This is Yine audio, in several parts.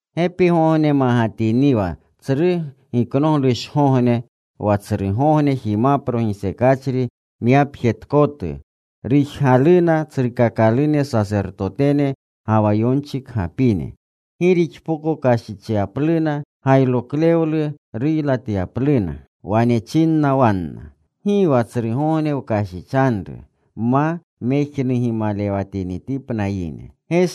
Gepigogne magatiniwa Tsru Giknoglushgogne wa Tsrugogne jimapro gisekachri myapjetkotu, rujgaluna tsrukakalune sasertotene, ga wa yonchikgapine gi rixpoko kashichyapluna gayroklewluya ruylatyapluna. Wane chinna wanna, “Gi wa tsrugogne wkashichanru, ma mejnugimalewatinitipna yine.”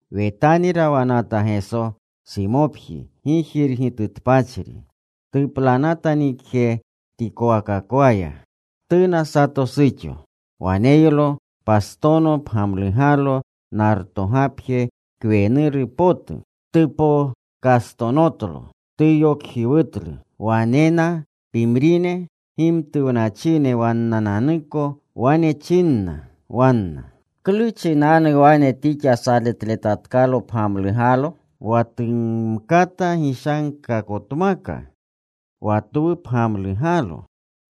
Wetani rawanata Geso Simopji gijirgitutpachri. Tuplanata nikjetikowakaya. Tuna sato suxo. Waneylo pastono pgamlugalo nartogapje kwenuru potu. Tupokastonotlo. Tuyokjiwutlu. Wanena pimrine gimtuwnachine wannananuko. Wane chinna wanna, “¿Klu chinanu wane tixa saletletatkalo pgamlugalo? Wa tumkata gishankakotmaka wa twu pgamlugalo,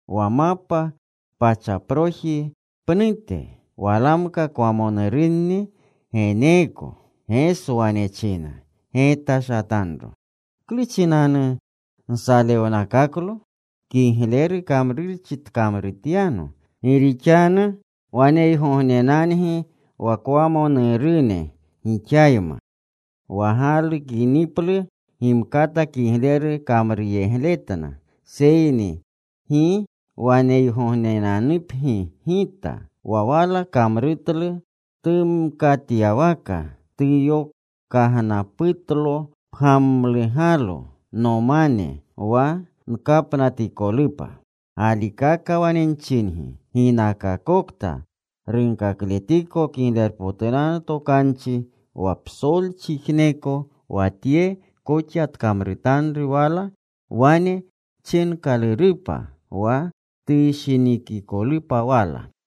wa mapa pachaproji pnute. Walamka kwamonurunni geneeko.” Geso wane china, “Getashatanro. ¿Klu chinanu nsalewnakaklo? Kigleru kamrurchi tkamrutyano. Gi rixanu waneygognenangi wa kwamonurune gixayma. Wa galukiniplu gimkata kigleru kamruyegletna, seyni gi waneygognenanupgi Gita. Wa wala kamrutlu tumkatyawaka. Tuyokagnaputlo pgamlugalo nomane wa nkapnatikolupa. Galikaka wane nchingi, ginakakokta runkakletiko Kiglerpotunanu Tokanchi wa psolchijneko wa tye koxa tkamrutanru wala wane chinkalurupa wa tushinikikolupa wala.”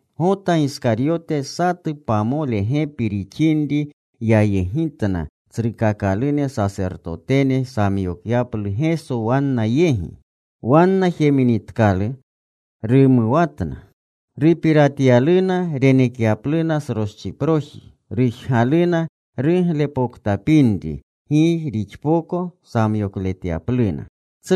Gota Giskaryote satu pamole gepi rixinri yayegitna tsrukakalune sasertotene samyokyaplu Geso wanna yegi. Wanna jeminitkalu, rumuwatna. Rupiratyaluna renekyapluna sroschiproji. Rujgaluna ruglepoktapinri gi rixpoko samyokletyapluna.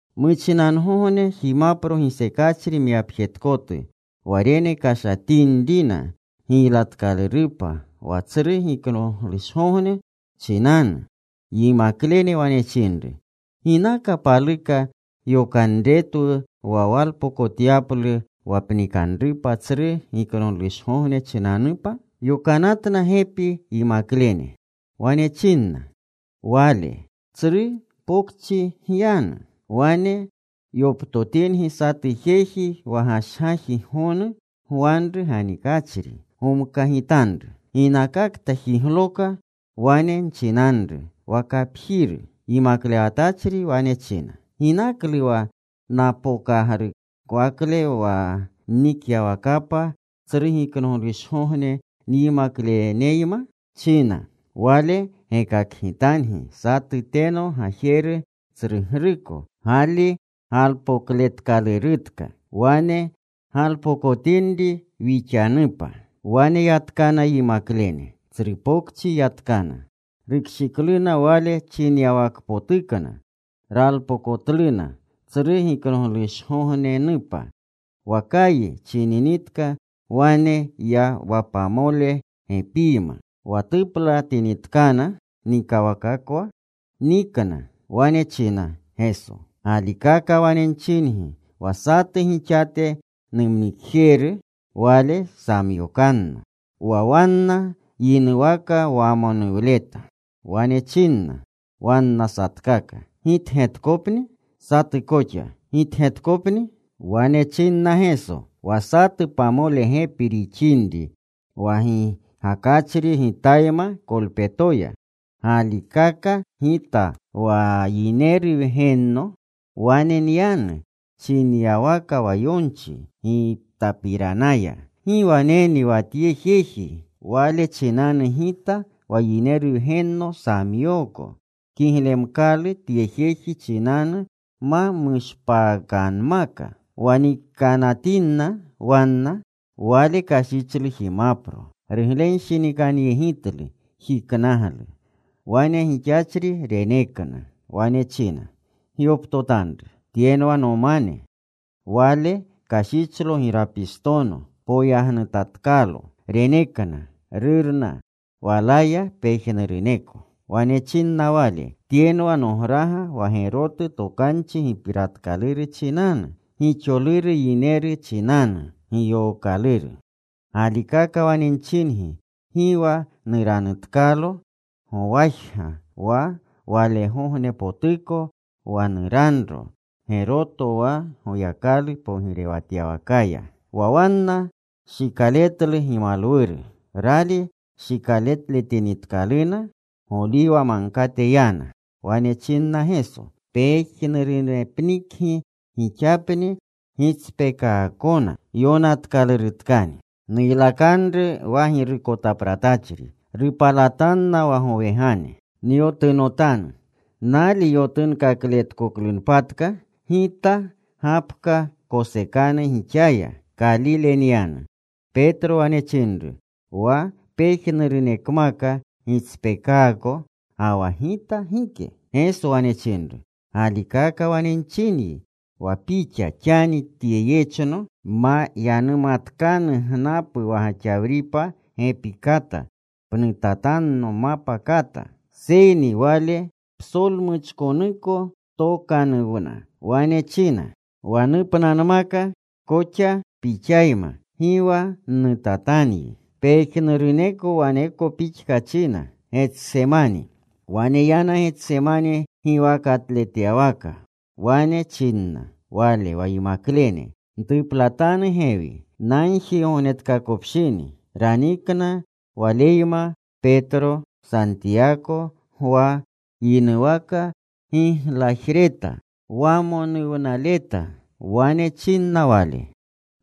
Muchinangogne jimapro gisekachri myapjetkotu wa renekashatinrina giylatkalurupa wa Tsru Giknoglushgogne chinanu, yimaklene wane chinru, “¿Ginaka paluka yokanretwu wa walpokotyaplu wa pnikanrupa Tsru Giknoglushgogne chinanupa?” Yokanatna gepi yimaklene. Wane chinna Wale, “Tsru pokchi gyanu. Wane yoptotingi satu jeji wa gashgaji gonu gwanru ganikachri. Gomkagitanru. Ginakakta jigloka wane nchinanru wa kapjiru, ‘Yimaklewatachri wane china, “¿Ginaklu wa napokagrukowakle wa nnikyawakapa Tsru Giknoglushgogne nyimakleneyma?” china.’ Wale gekakgitangi satu teno gajeru tsrugruko gali galpokletkalurutka. Wane galpokotinri wixanupa.” Wane yatkana yimaklene. Tsru pokchi yatkana. Rukshikluna Wale chinyawakpotukna. Ralpokotluna Tsru Giknoglushgognenupa. Wa kayi chininitka wane ya wa pamole gepiyma. Wa tuplatinitkana nikawakakwa, nikna. Wane china Geso, “Galikaka wane nchingi, wa satu gixate numnikjeru, wale samyokanno.” Wa wanna yinuwaka wamonuwleta. Wane chinna wanna satkaka, “¿Gitgetkopni?” Satu koxa, “¿Gitgetkopni?” Wane chinna Geso, “Wa satu pamole gepi rixinri, wa gigakachri Gitayma kolpetoya. Galikaka Gita wa Yineru Wgenno wane nyanu chinyawaka wa yonchi Gitapiranaya. ¡Gi waneni wa tye jeji, wale chinanu Gita wa Yineru Wgenno samyooko! Kiglemkalu tye jeji chinanu ma mushpaakanmaka.” Wa nikanatinna wanna, Wale kashichlu jimapro. Ruglenshinikanyegitlu. Jiknaglu. Wane gixachri renekna. Wane china, “Gyoptotanru. Tyenwa nomane.” Wale kashichlo girapistono. Poyagnutatkalo. Renekna. Rurna walaya pejnuruneko. Wane chinna Wale, “Tyenwa nograga wa gerotu tokanchi gipiratkaluru chinanu, gixoluru yineru chinanu giyookaluru. Galikaka wane nchingi, gi wa nuranutkalo gowajiga wa walegognepotuko wa nuranro geroto wa Goyakalu pogirewatyawakaya.” Wa wanna shikaletlu gimalwuru. Rali shikaletinitkaluna, Goliwa Magkate yana. Wane chinna Geso, “Pejnurunepnikgi gixapni gitspeekaakona. Yonatkalurutkani: Nuylakanru wa girukotapratachri. Rupalatanna wa gowegane. Nyotunotanu. Nali yotunkakletkoklunpatka, Gita gapka kosekanu gixaya. Kalile nyanu.” Petro wane chinru, “Wa pejnurunekmaka gitspeekaako, ga wa gita gike.” Geso wane chinru, “Galikaka wane nchinyi, wa pixa xani tye yechno ma yanumatkanu gnapu wa gaxawripa gepi kata, pnutatanno mapa kata.” Seyni wale psolmuchkonuko tokanuwna. Wane china, “Wa nupnanmaka koxa Pixayma, gi wa nnutatanyi.” Pejnuruneko waneko pixka china. Wane yana Getsemani giwakatletyawaka. Wane chinna Wale wa yimaklene, “Ntuplatanu gewi. Nagjigognetkakopshini.” Ranikna Waleyma Petro, Santiyako, Gwa. Yinuwaka giglajreta, wamonuwnaleta. Wane chinna Wale,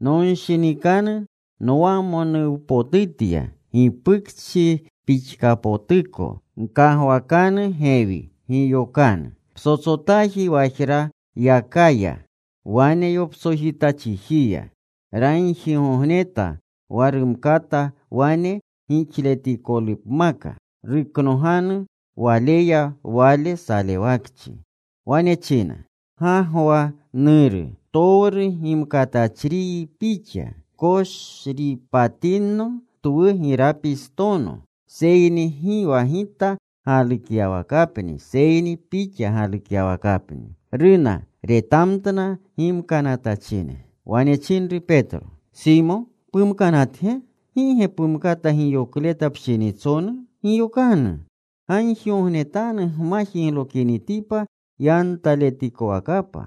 “Nonshinikanu nwamonuwnapotutya gipukchi pixkapotuko. Gkagwakanu gewi. Giyokanu.” Psotsotaaji wajrayaka ya. Wane yoptsojita chijiya. Ragjigogneta wa rumkata wane gixletikolupmaka, ruknoganu Waleya wale salewakchi. Wane china, “Gagwa, Nuru, ptowru gimkatachriyi Pixa. Pkoshripatinno twu girapistono, seyni gi wa Gita galukyawakapni, seyni Pixa galukyawakapni.” Runa. Retamtna gimkanatachine. Wane chinru Petro, “¿Simo, pumkanatge? ¿Gi ge pumkata giyokleta pshinitsonu? Giyokanu. Gagjigognetanu gma jiglokinitipa yantaletikowakapa.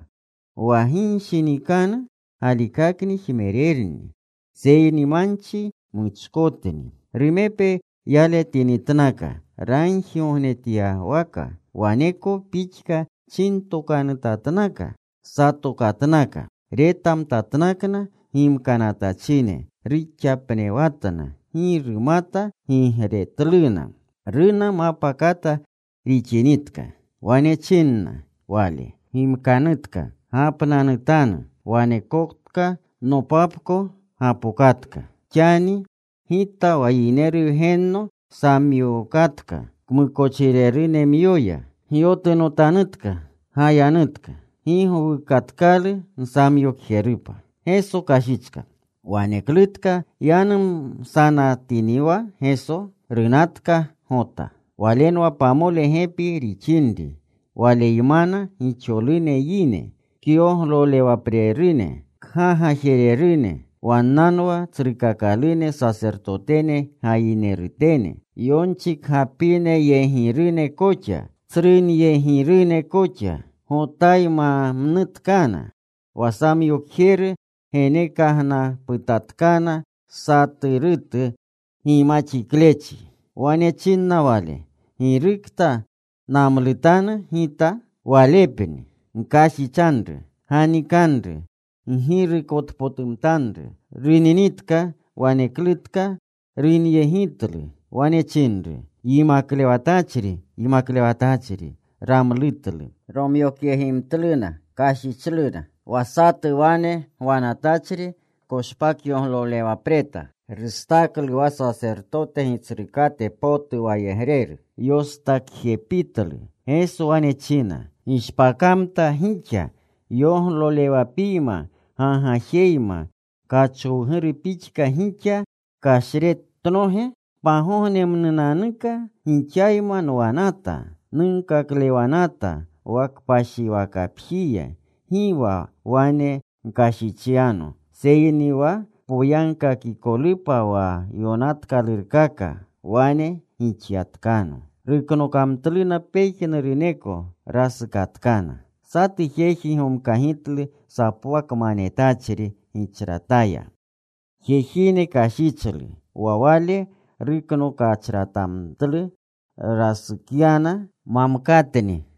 Wa ginshinikanu galikakni jmererni, seyni manchi muchkotni.” Rumepe yaletinitnaka ragjigognetyawaka, waneko pixka chintokanutatnaka. Satokatnaka. Retamtatnakna gimkanatachine. Ruxapnewatna. Gi rumata gigretluna. Runa mapa kata rixinritka. Wane chinna Wale, “Gimkanutka. Gapnanutanu. Wanekotka. Nopapko gapokatka. Xani Gita wa Yineru Wgenno samyookatka kmukochirerunemyoya. Gyotunotanutka. Gayanutka. Gi gowukatkalu nsamyokjerupa.” Waneklutka yanumsanatiniwa Geso, runatka Gota. Walenwa pamole gepi rixinri. Waleymana gixolune yine kyoglolewaprerune, kgagajererune. Wannanwa tsrukakalune sasertotene gayinerutene, yonchikgapineyegirune koxa, tsrunyegirune koxa. Gotaymamnutkana. Wa samyokjeru genekagnaputatkana saturutu gimaxiklechi. Wane chinna wale, “Girukta namlutanu gita, Walepakni. Gkashichanru. Ganikanru. Ggirukotpotumtanru.” Runinitka, waneklutka runyegitlu. Wane chinru, “¡Yimaklewatachri! ¡Yimaklewatachri!” Ramlutlu. Romyokyegimtluna. Kashichluna. Wa satu wane gwanatachri koshpakyoglolewapreta. Rustaklu wa sasertote gitsrukate potu wayegreru. Yostakjepitlu. Geso wane china, “¿Gishpakamta gixa yoglolewapiyma gagajeyma, kachowguru pixka gixa kashretnoge? Pagognemnunanuka gixayma nwanata, nunkaklewanata wa kpashiwakapjiya. Gi wa wane gkashichyano, seyni wa poyagkakikolupa wa yonatkalurkaka, wane gixyatkano.” Ruknokamtluna pejnuruneko. Rasukatkana. Satu jeji gomkagitlu sapwakmanetachri gichrataya. Jejine kashichlu. Wa wale ruknokachratamtlu. Rasukyana mamkatni.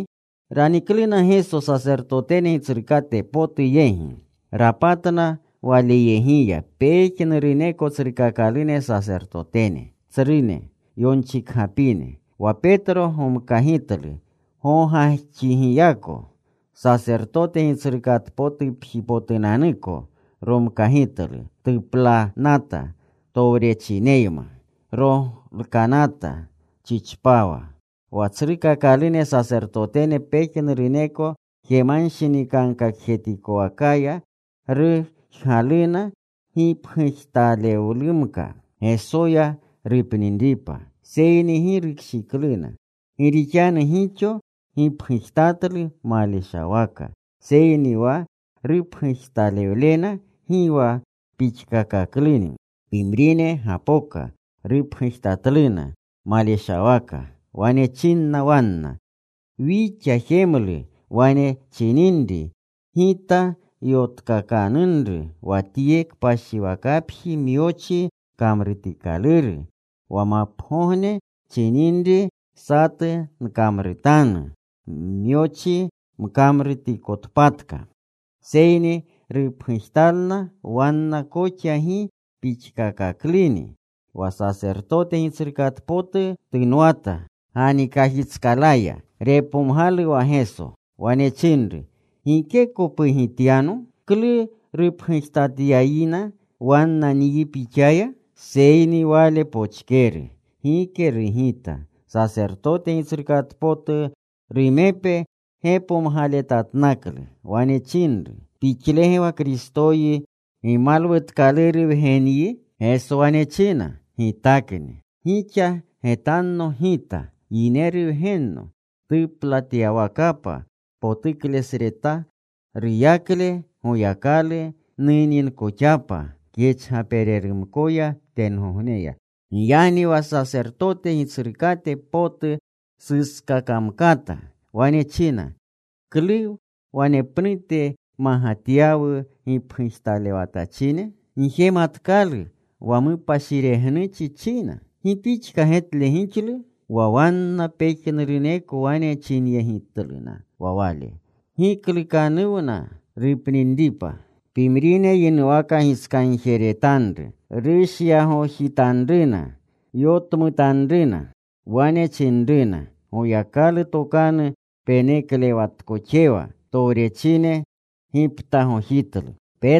Ranikluna Geso sasertotene gitsrukate potu yegi. Rapatna Walyegiya pejnuruneko tsrukakalune sasertotene, tsrune, yonchikgapine. Wa Petro gomkagitlu gogajxigiyako. Sasertote gitsrukatpotupjipotunanuko romkagitlu. Tuplanata towrechineyma. Rolkanata chichpawa. Wa tsrukakalune sasertotene, pejnuruneko jemanshinikankakjetikowakaya rujgaluna gipgujtalewlumka Gesoya rupninripa, seyni gi rukshikluna. Gi rixanu gixo gipgujtatlu maleshawaka, seyni wa rupgujtalewlena gi wa pixkakakluni. Pimrine gapoka. Rupgujtatluna maleshawaka. Wane chinna wanna, “Wixa jemlu wane chininri, ‘Gita yotkakanunru wa tye kpashiwakapji myochi kamrutikaluru. Wa mapagogne chininri satu nkamrutanu myochi mkamrutikotpatka.’” Seyni rupgujtalna wanna koxa gi pixkakakluni. Wa sasertote gitsrukate potu tunwata ganikajitskalaya. Repomgalu wa Geso. Wane chinru, “¿Gikeko pugityano? ¿Klu rupgujtatyayina wanna nyi Pixaya?” Seyni Wale pochkeru. Gike rugita. Sasertote gitsrukate potu rumepe gepomgaletatnaklu. Wane chinru, “¿Pixlege wa Kristoyi Gimalwutkaluru Wgenyi?” Geso wane china, “Gitakni. Gixa getanno Gita, Yineru Wgenno, tuplatyawakapa potuklesreta ruyakle Goyakalu, nuninkoxapa kyachgapererumkoya tengogneya.” Giyagni wa sasertote gitsrukate potu suskakamkata. Wane china, “¿Klu wanepnute magatyawu gipgujtalewatachine? Gjematkalu wa mupashiregnuchi china. ¿Gi pixka getle gixlu?” Wa wanna pejnuruneko wane chinyegitluna wa Wale giklukanuwna rupninripa. Pimrine yinuwaka gitskagjeretanru, rushyagojitanruna, yotmutanruna. Wane chinruna, “Goyakalu tokanu peneklewatkoxewa.” Towrechine giptagojitlu.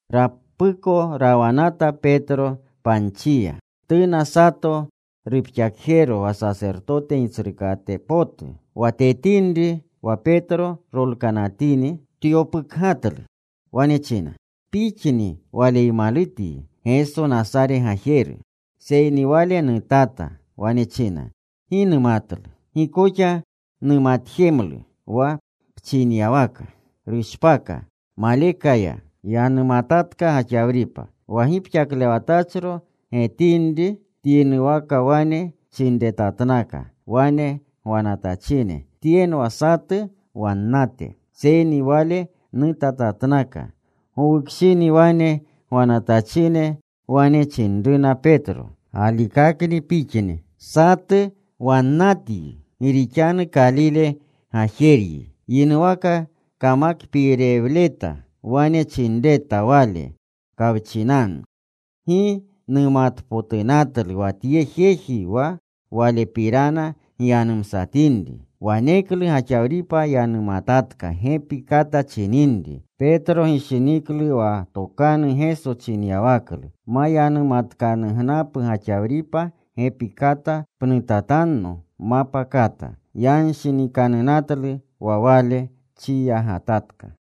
Rapuko rawanata Petro panchiya. Tuna sato rupxakjero wa sasertote gitsrukate potu. Wa tetinri wa Petro rolkanatini, tyopukgatlu. Wane china, “Pixni Waleymalutyi, Geso Nasare gajeru.” Seyni wale nutata. Wane china, “Gi numatlu. Gi koxa numatjemlu wa pchinyawaka.” Rushpaka. Maleka ya. Yanumatatka gaxawripa. Wa gipxaklewatachro getinri, tyinuwaka wane chinretatnakna wane gwanatachine, “Tyenwa satu wannate.” Seyni wale nutatatnaka. Gowukshini wane gwanatachine wane chinruna Petro, “Galikakni pixni satu wannatyi. Gi rixanu Kalile gajeryi.” Yinuwaka kamakpiirewleta, wane chinreta Wale kawchinanu, “Gi numatpotunatlu wa tye jeji wa Walepirana gyanumsatinri.” Waneklu gaxawripa yanumatatka gepi kata chininri. Petro gishiniklu wa tokanu Geso chinyawaklu, “Ma yanumatkanugnapu gaxawripa gepi kata, pnutatanno mapa kata.” Yanshinikanunatlu wa wale, chiyagatatka.